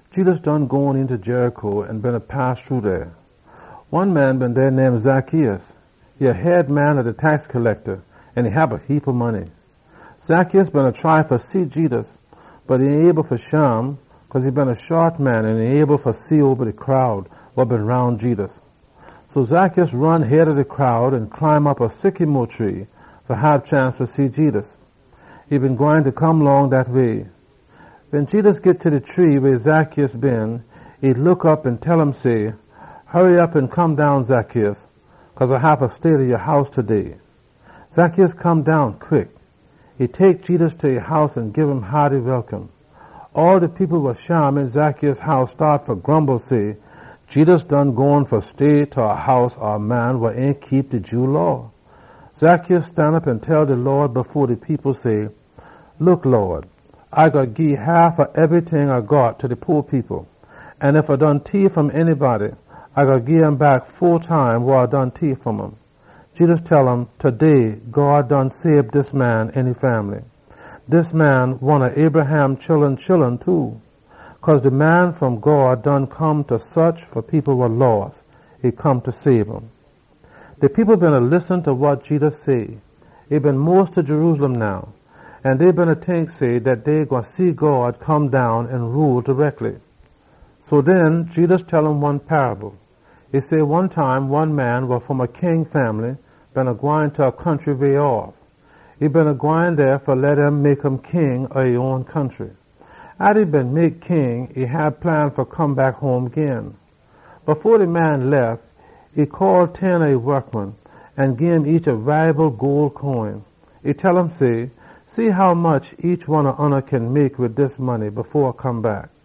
Jedus done gone eenta Jericho an beena pass shru dey. One man been dey name Zacchaeus. E been a head man ob dem wa da geda tax, an e hab a heapa money. Zacchaeus beena try fa see Jedus, bot e ain been able fa shim cause e been a shot man an e ain been able fa see oba de crowd wa been roun Jedus. So Zacchaeus ron head ob de crowd an climb op a sycamo tree fa hab chance fa see Jedus, wa been gwine come long dat way. Wen Jedus git ta de tree weh Zacchaeus been, e look op an tell um say, “Hurry op an come down, Zacchaeus, cause A haffa stay ta ya house taday.” Zacchaeus come down quick. E tek Jedus ta e house an gim haaty welcome. All de people wa shim een Zacchaeus house staat fa grumble say, “Jedus gone fa stay ta de house ob a man wa ain keep de Jew Law.” Zacchaeus stanop an tell de Lawd say, “Look, Lawd! A gwine gii haf ob ebryting A got ta de po people. An ef A done tief fom anybody, A gwine gim back fo time wa A done tief fom um.” Jedus tell um, “Taday God done sabe dis man an e fambly. Dis man one ob Abraham chullun too. Cause de Man wa Come fom God, e come fa saach fa people wa loss, an sabe um.” De people beena listen ta wa Jedus say. E been mos ta Jerusalem now, an dey beena tink say dat dey gwine see God come down an rule tareckly. So den, Jedus tell um one paable. E say, “One time one man wa fom a king fambly beena gwine ta a country faa way fa leh dem mek um king an den e gwine come back home gin. Fo de man lef, e call ten ob e wokman dem an gim each a gole coin. E tell um say, ‘See hommuch ya kin mek wid dis money fo A come back.’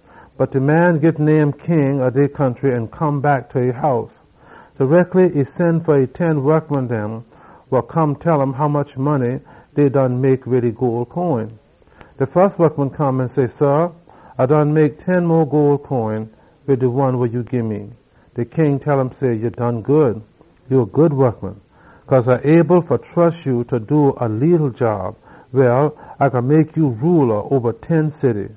“Bot de man git mek king ob dey country, an e come back ta e house. Tareckly e sen fa e ten wokman dem fa come tell um hommuch money dey been mek wid e gole coin. De fus wokman come an say, ‘Sah, A done mek ten mo gole coin wid de one wa ya gii me.’ De king tell um say, ‘Ya done good. Ya a good wokman. Cause A able fa trus ya fa do a leetle job, A gwine mek ya rula oba ten city.’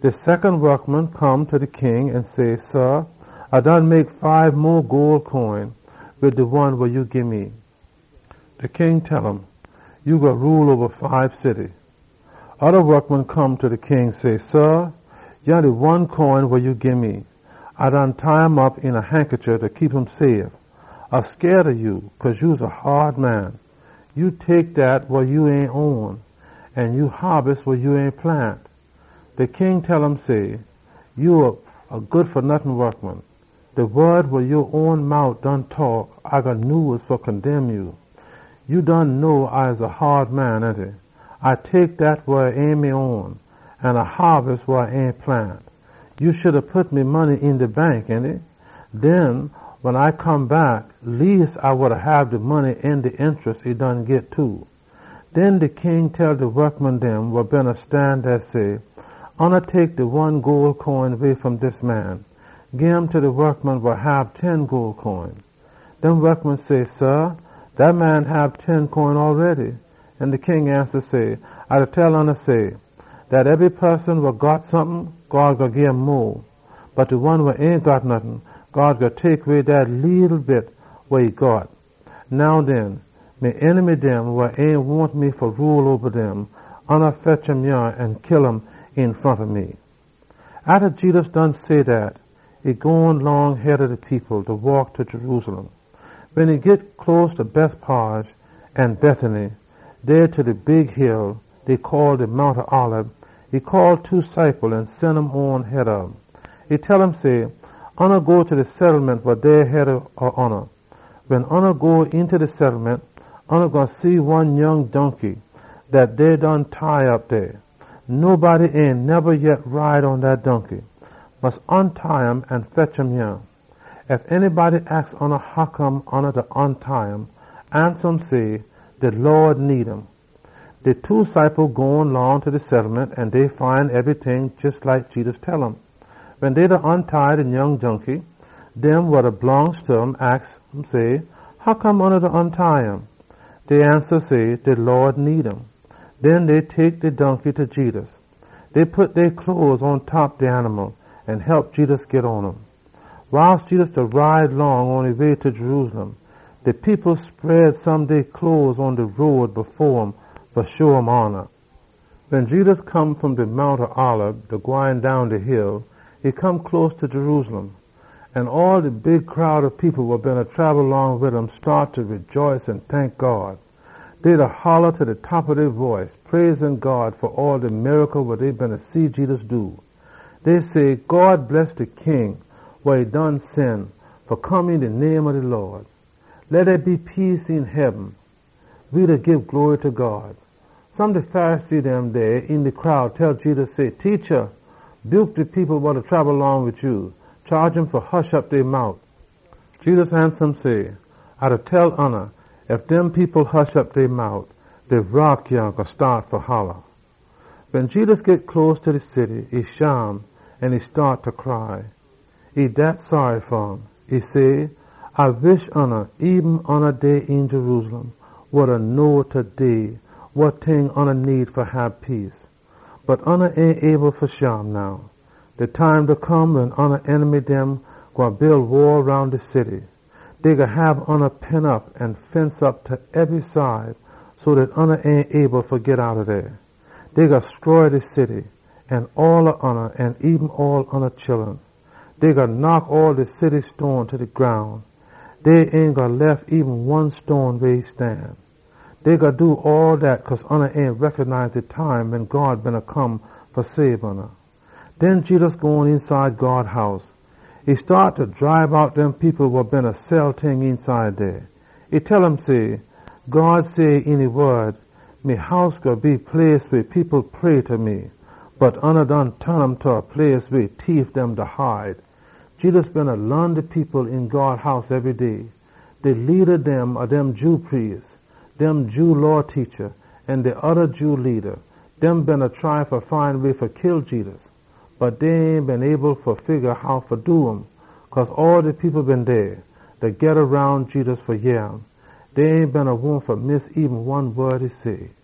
De secon wokman come ta de king an say, ‘Sah, A done mek fibe mo gole coin wid de one wa ya gii me.’ De king tell um say, ‘Ya gwine rule oba fibe city.’ Oda wokman come ta de king say, ‘Sah, yah de one gole coin wa ya been gii me. A been tie um op een a hankachief fa keep um safe. A been scaid ob ya cause ya a haad man. Ya da tek dat wa ain ya own an ya da haabis wa ya ain plant!’ De king tell um say, ‘Ya a good fa nottin wokman. De wod wa ya own mout done taak A gwine nyuse fa condemn ya! Ya know A a haad man, ainty? A da tek dat wa ain me own an A da haabis wa A ain plant. Ya oughta hab pit me money een de bank, an den wen A come back, leas A been gwine hab de money an de interest e done git too.’ Den de king tell de wokman dem wa beena stan dey, say, ‘Oona tek de one gole coin way fom dis man an gim ta de wokman wa hab ten.’ Dem wokman say, ‘Sah, dat man done hab ten coin!’ An de king ansa say, ‘A da tell oona say, dat ebry poson wa got sompin, God gwine gim mo. Bot de one wa ain got nottin, God gwine tek way dat leeleetle bit wa e got. Now den, me enemy dem wa ain wahn me fa rule oba dem, fetch um yah an kill um een front ob me!’” Atta Jedus say dat, e gone long head ob de people, da waak ta Jerusalem. Wen e git close ta Bethphage an Bethany, dey ta de Mount Olib, e call two ob e ciple dem an e sen um on head ob um. E tell um say, “Oona go ta de settlement wa dey head ob oona. Wen oona go eenta de settlement, oona gwine see one nyoung donkey dat dey done tie op dey. Nobody ain neba yet ride pon dat donkey. Mus ontie um an fetch um yah. Ef anybody aks oona hoccome ya da ontie um, ansa um say, ‘De Lawd need um.’” De two ciple dem gone long ta de settlement an dey find ebryting jes like Jedus tell um. Wen dey beena ontie de nyoung donkey, dem wa e blongst ta aks um say, “Hoccome oona da ontie um?” Dey ansa say, “De Lawd need um.” Den dey tek de donkey ta Jedus. Dey pit dey cloes pontop de animal an hep Jedus git pon um. Wiles Jedus beena ride long pon e way ta Jerusalem, de people spread some dey cloes pon de road fo um fa sho um hona. Wen Jedus come fom de Mount Olib, da gwine down de hill, e come close ta Jerusalem. An all de big crowd ob people wa beena trabel long wid um staat fa rejaice an tank God. Dey beena holla ta de top ob dey boice, da praise God fa all de miracle dem wa dey beena see Jedus do. Dey say, “God bless de King wa e done sen fa come een de name ob de Lawd! Leh dey be peace een heaben. We da gii glory ta God!” Some de Pharisee dem dey een de crowd tell Jedus say, “Teacha, buke dem people wa da folla ya. Chaage um fa hush op dey mout!” Jedus ansa um say, “A da tell oona, ef dem people hush op dey mout, dem rock yah gwine staat fa holla!” Wen Jedus git close ta de city, e shim an e staat fa cry. E say, “A wish oona dey een Jerusalem been know taday wa ting oona need fa hab peace! Bot oona ain able fa shim now! De time da come wen oona enemy dem gwine build wall roun de city. Dey gwine hab oona pen op an fence op ta ebry side so dat oona ain gwine be able fa git outta dey. Dey gwine stroy de city an all ob oona an eben all oona chullun. Dey gwine knock all de city stone dem ta de groun. Dey ain gwine lef eben one stone weh e stan. Dey gwine do all dat cause oona ain recognize de time wen God beena come fa sabe oona!” Den Jedus gone eenside God House. E staat fa dribe out dem people wa beena sell ting eenside dey. E tell um say, “God say een e wod, ‘Me house gwine be place weh people pray ta me!’ Bot oona done ton um ta place weh tief dem da hide!” Jedus beena laan de people een God House ebry day. De leada dem ob de Jew priest dem, de Jew Law teacha dem, an de oda Jew leada dem beena try fa find way fa kill Jedus. Bot dey ain been able fa figga how fa do um, cause all de people been dey, beena geda roun Jedus fa yeh um. Dey ain been wahn fa miss eben one wod e say.